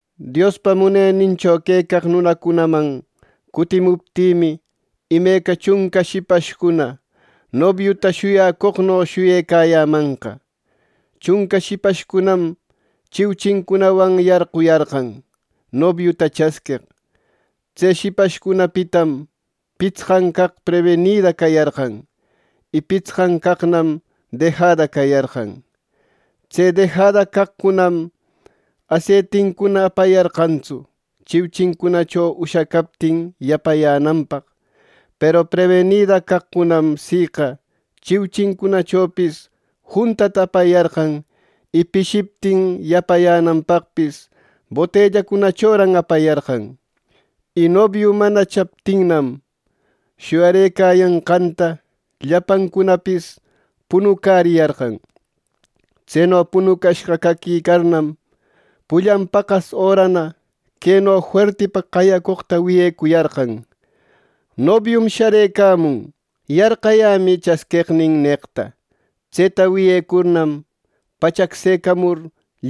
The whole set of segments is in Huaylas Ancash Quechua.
“Diospa munenincho quecaq nunacunaman cutimuptïmi imeca, chunca shipashcuna nobiuta shuyacoqno shuyecayämanqa. Chunca shipashcunam chiuchincunawan yarquyarqan, nobiuta chasqueq. Tse shipashcunapitam pitsqan caq prebinida cayarqan. Y pitsqan caqnam dejada cayarqan. Tse dejada caqcunam aseitincuna apayarqantsu chiuchincunacho ushacaptin yapayänanpaq Peru prebinida caqcunam siqa chiuchincunachopis juntata apayarqan y pishiptin yapayänanpaqpis botellacunachoran apayarqan. Y nobiu mana chaptinnam, shuyarëcayanqanta llapancunapis punucäriyarqan Tseno punucashqa caquicarnam, pullan paqas örana queno fuertipa qayacoqta wiyecuyarqan: ‘¡Nobium sharëcamun! ¡Yarqayämï chasqueqnin!’ neqta. Tseta wiyecurnam, pachaqsecamur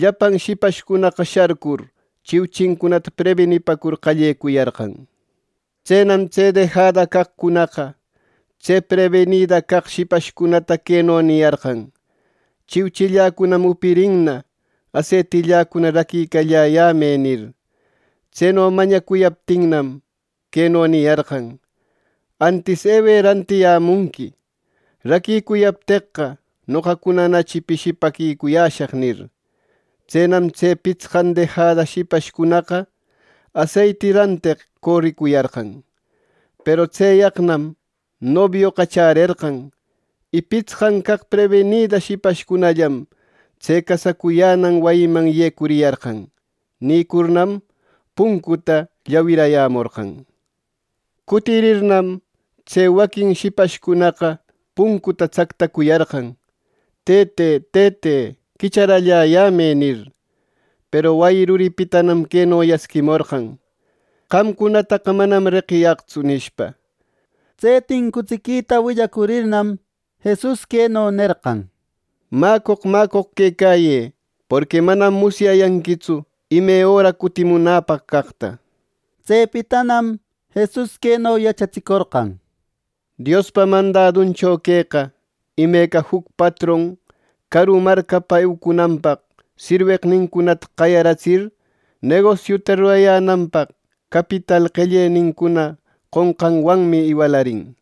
llapan shipashcunaqa sharcur, chiuchincunata prebinipacur qallecuyarqan. Tsenam tse dejada caqcunaqa, tse prebinida caq shipashcunata queno niyarqan: ‘Chiuchilläcunam upirinna. Aseitilläcuna raquiralläyämë’ nir. Tseno mañacuyaptinnam, queno niyarqan: ‘Antis ewë rantirayämunqui. Raquicuyarniqueqa, noqacunanachi pishipäquicuyäshaq’ nir. Tsenam tse pitsqan dejada shipashcunaqa aseiti ranteq coricuyarqan. Peru tseyaqnam nobioqa chärerqan, y pitsqan caq prebinida shipashcunallam tse casacuyänan wayiman yecuriyarqan. Nïcurnam, puncuta llawirayämorqan. Cutirirnam, tse waquin shipashcunaqa puncuta tsactacuyarqan: ‘¡Tëte, Tëte, quicharalläyämë!’ nir. Peru wayi ruripitanam queno yasquimorqan: ‘¡Qamcunataqa manam reqiyaqtsu!’ nishpa.” Tse tincutsiquita willacurirnam, Jesus queno nerqan: —¡Mäcoq, mäcoq quecayë! Porqui manam musyayanquitsu ime öra cutimunäpaq caqta. Tsepitanam Jesus queno yachatsicorqan: “Diospa mandaduncho queqa, imeca juc patron caru marcapa eucunanpaq sirweqnincunata qayaratsir, negosiuta rurayänanpaq capital qellenincuna qonqanwanmi iwalarin.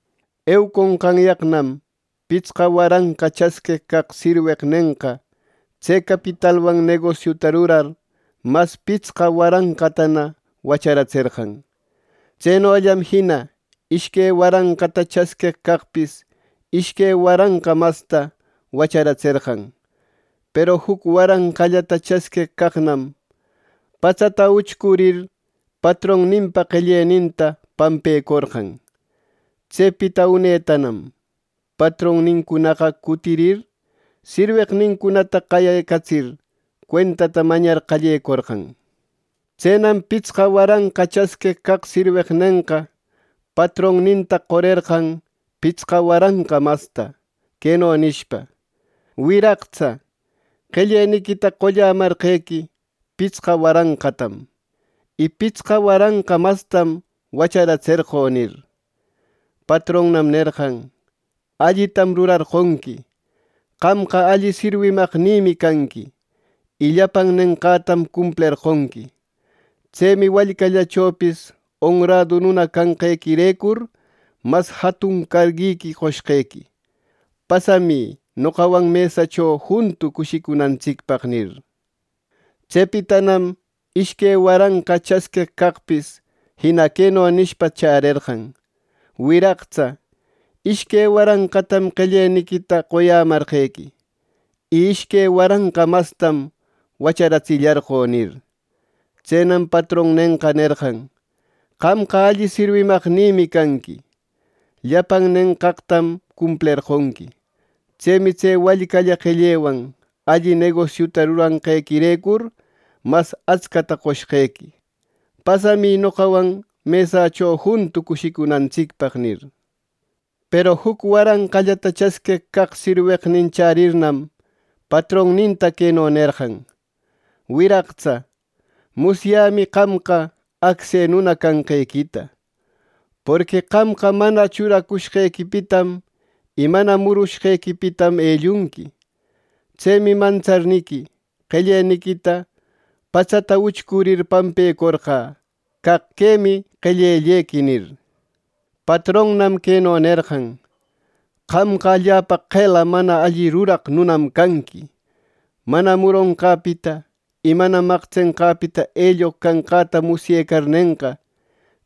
Euconqanyaqnam pitsqa waranqa chasqueq caq sirweqnenqa tse capitalwan negosiuta rurar, mas pitsqa waranqatana wacharatserqan. Tsenollam jina ishque waranqata chasqueq caqpis ishque waranqa masta wacharatserqan. Peru juc waranqallata chasqueq caqnam patsata uchcurir, patronninpa qelleninta pampecorqan. “Tsepita unetanam patronnincunaqa cutirir, sirweqnincunata qayecatsir, cuentata mañar qallecorqan. Tsenam pitsqa waranqa chasqueq caq sirweqnenqa patronninta qorerqan pitsqa waranqa masta, queno nishpa: ‘Wiraqtsa, qelleniquita qollamarqequi pitsqa waranqatam, y pitsqa waranqa mastam wacharatserqö’ nir. Patronnan nerqan: ‘Allitam rurarqonqui. ¡Qamqa alli sirwimaqnïmi canqui, y llapan nenqaqtam cumplerqonqui! Tsemi wallcallachopis onradu nuna canqequirecur, mas jatun carguiqui qoshqequi. Pasamï noqawan mesächo juntu cushicunantsicpaq’ nir. Tsepitanam ishque waranqa chasqueq caqpis jina queno nishpa chärerqan: ‘Wiraqtsa, ishque waranqatam qellellequita qoyämarqequi, y ishque waranqa mastam wacharatsillarqö’ nir. Tsenam patronnenqa nerqan: ‘¡Qamqa alli sirwimaqnïmi canqui! Llapan nenqaqtam cumplerqonqui. Tsemi tse wallcalla qellewan alli negosiuta ruranqequirecur mas atscata qoshqequi. Pasamï noqawan mesacho juntu cushicunantsicpaq’ nir. “Peru juc waranqallata chasqueq caq sirweqnin chärirnam, patronninta queno nerqan: ‘Wiraqtsa, musyämi qamqa acse nuna canqequita. Porqui qamqa mana churacushqequipitam, y mana murucushqequipitam ellunqui. Tsemi mantsarniqui, qelleniquita patsata uchcurir paquecorqä, caq quemi qellellequi’ nir. Patronan queno nerqan: ‘Qamqa allapa qela mana alli ruraq nunam canqui. Mana muronqäpita y mana maqtsenqäpita elloq canqäta musyecarnenqa,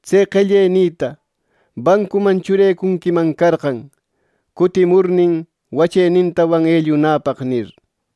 tse qellenïta bancuman churecunquiman carqan, cutimurnin wachenintawan ellunäpaq’ nir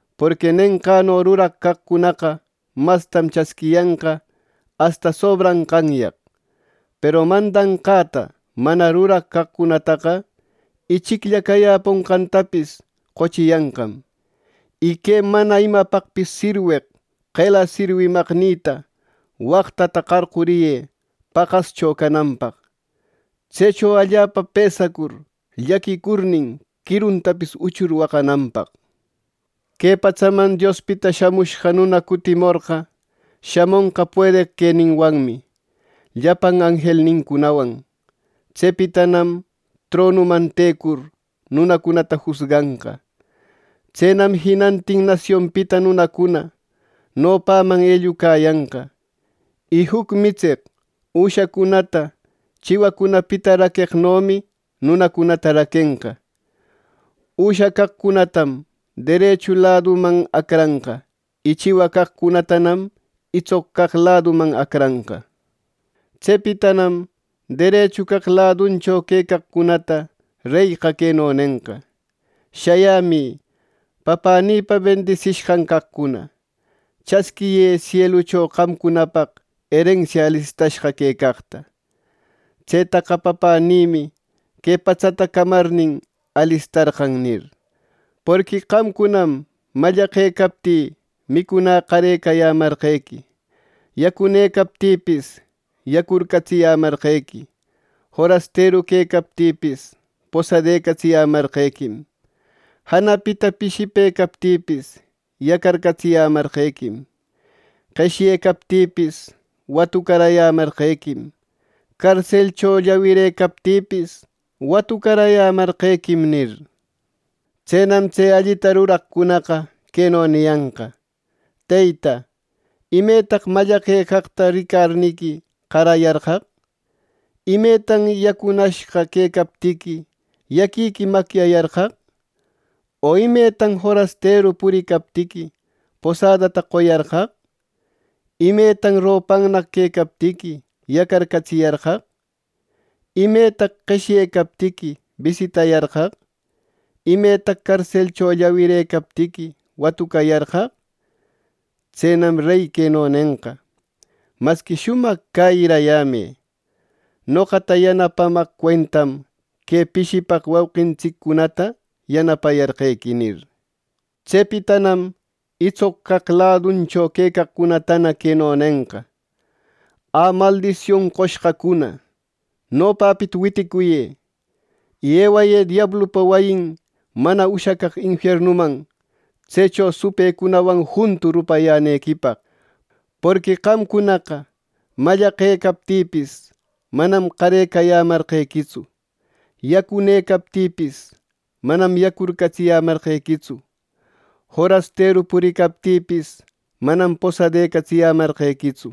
porqui nenqäno ruraq caqcunaqa mastam chasquiyanqa asta sobranqanyaq; peru mandanqäta mana ruraq caqcunataqa, ichiclla cayäponqantapis qochiyanqam. Y que mana imapaqpis sirweq qela sirwimaqnïta waqtata qarcuriyë paqascho cananpaq. Tsecho allapa pësacur llaquicurnin, quiruntapis uchur waqananpaq.’ “Que patsaman Diospita Shamushqa Nuna cutimorqa, shamonqa puedeq queninwanmi, llapan anjelnincunawan. Tsepitanam tronuman tecur, nunacunata jusganqa. Tsenam jinanatin nasionpita nunacuna nopanman ellucayanqa. Y juc mitseq üshacunata chiwacunapita raqueqnomi nunacunata raquenqa. Üsha caqcunatam derechu laduman acranqa; y chiwa caqcunatanam itsoq caq laduman acranqa. Tsepitanam derechu caq laduncho quecaqcunata reyqa queno nenqa: ‘Shayämï papänïpa bendisishqan caqcuna. Chasquiyë sielucho qamcunapaq erensia alistashqa quecaqta. Tsetaqa Papänïmi que patsata camarnin, alistarqan’ nir. ‘Porqui qamcunam mallaqecaptï, micunä qarecayämarqequi; yacunëcaptïpis, yacurcatsiyämarqequim; forasteru quecaptïpis, posadecatsiyämarqequim; janapita pishipëcaptïpis, yacarcatsiyämarqequim; qeshyecaptïpis, watucarayämarqequim; carselcho llawirëcaptïpis, watucarayämarqequim’ nir. Tsenam tse allita ruraqcunaqa queno niyanqa: ‘Teyta, ¿Imetaq mallaqecaqta ricarniqui, qarayarqaq? ¿Imetan yacunashqa quecaptiqui, yaquiqui macyayarqaq? O ¿Imetan forasteru puricaptiqui, posadata qoyarqaq? ¿Imetan ropannaq quecaptiqui, yacarcatsiyarqaq? ¿Imetan qeshyecaptiqui, bisitayarqaq? O ¿Imetaq carselcho llawirëcaptiqui, watucayarqaq?’ Tsenam reyqa queno nenqa: ‘Masqui shumaq cäyirayämë. Noqata yanapamaq cuentam que pishipaq wauqintsiccunata yanapecuyarqequi’ nir. “Tsepitanam itsoq caq laduncho quecaqcunatana queno nenqa: ‘Ä, maldision qoshqacuna, nopäpita witicuyë, y ewayë diablupa wayin mana ushacaq infiernuman tsecho supëcunawan juntu rupayänequipaq, porqui qamcunaqa mallaqecaptïpis, manam qarecayämarqequitsu; yacunëcaptïpis, manam yacurcatsiyämarqequitsu; forasteru puricaptïpis, manam posadaquecatsiyämarqequitsu;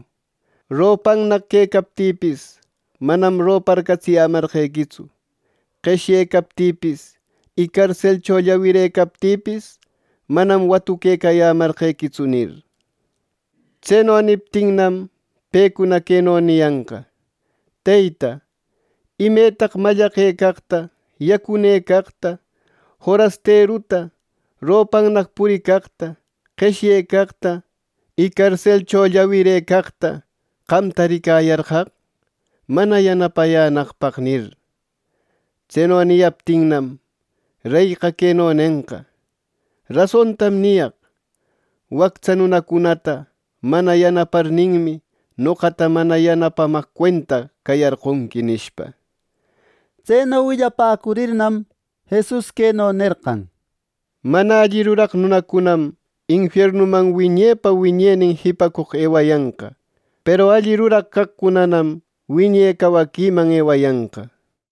ropannaq quecaptïpis, manam roparcatsiyämarqequitsu; qeshyecaptïpis y carselcho llawirëcaptïpis, manam watuquecayämarqequitsu’ nir. Tseno niptinnam pecunana queno niyanqa: ‘Teyta, ¿Imetaq mallaqecaqta, yacunëcaqta, forasteruta, ropannaq puricaqta, qeshyecaqta y carselcho llawirëcaqta qamta ricayarqaq, mana yanapayänaqpaq?’ nir. Tseno niyaptinnam, reyqa queno nenqa: ‘Rasontam niyaq: Wactsa nunacunata mana yanaparninmi, noqata mana yanapamaq cuenta cayarqonqui’” nishpa. Tseno willapäcurirnam, Jesus queno nerqan: —Mana alli ruraq nunacunam infiernuman wiñepa, wiñenin jipacoq ewayanqa; peru alli ruraq caqcunanam wiñe cawaquiman ewayanqa —nir.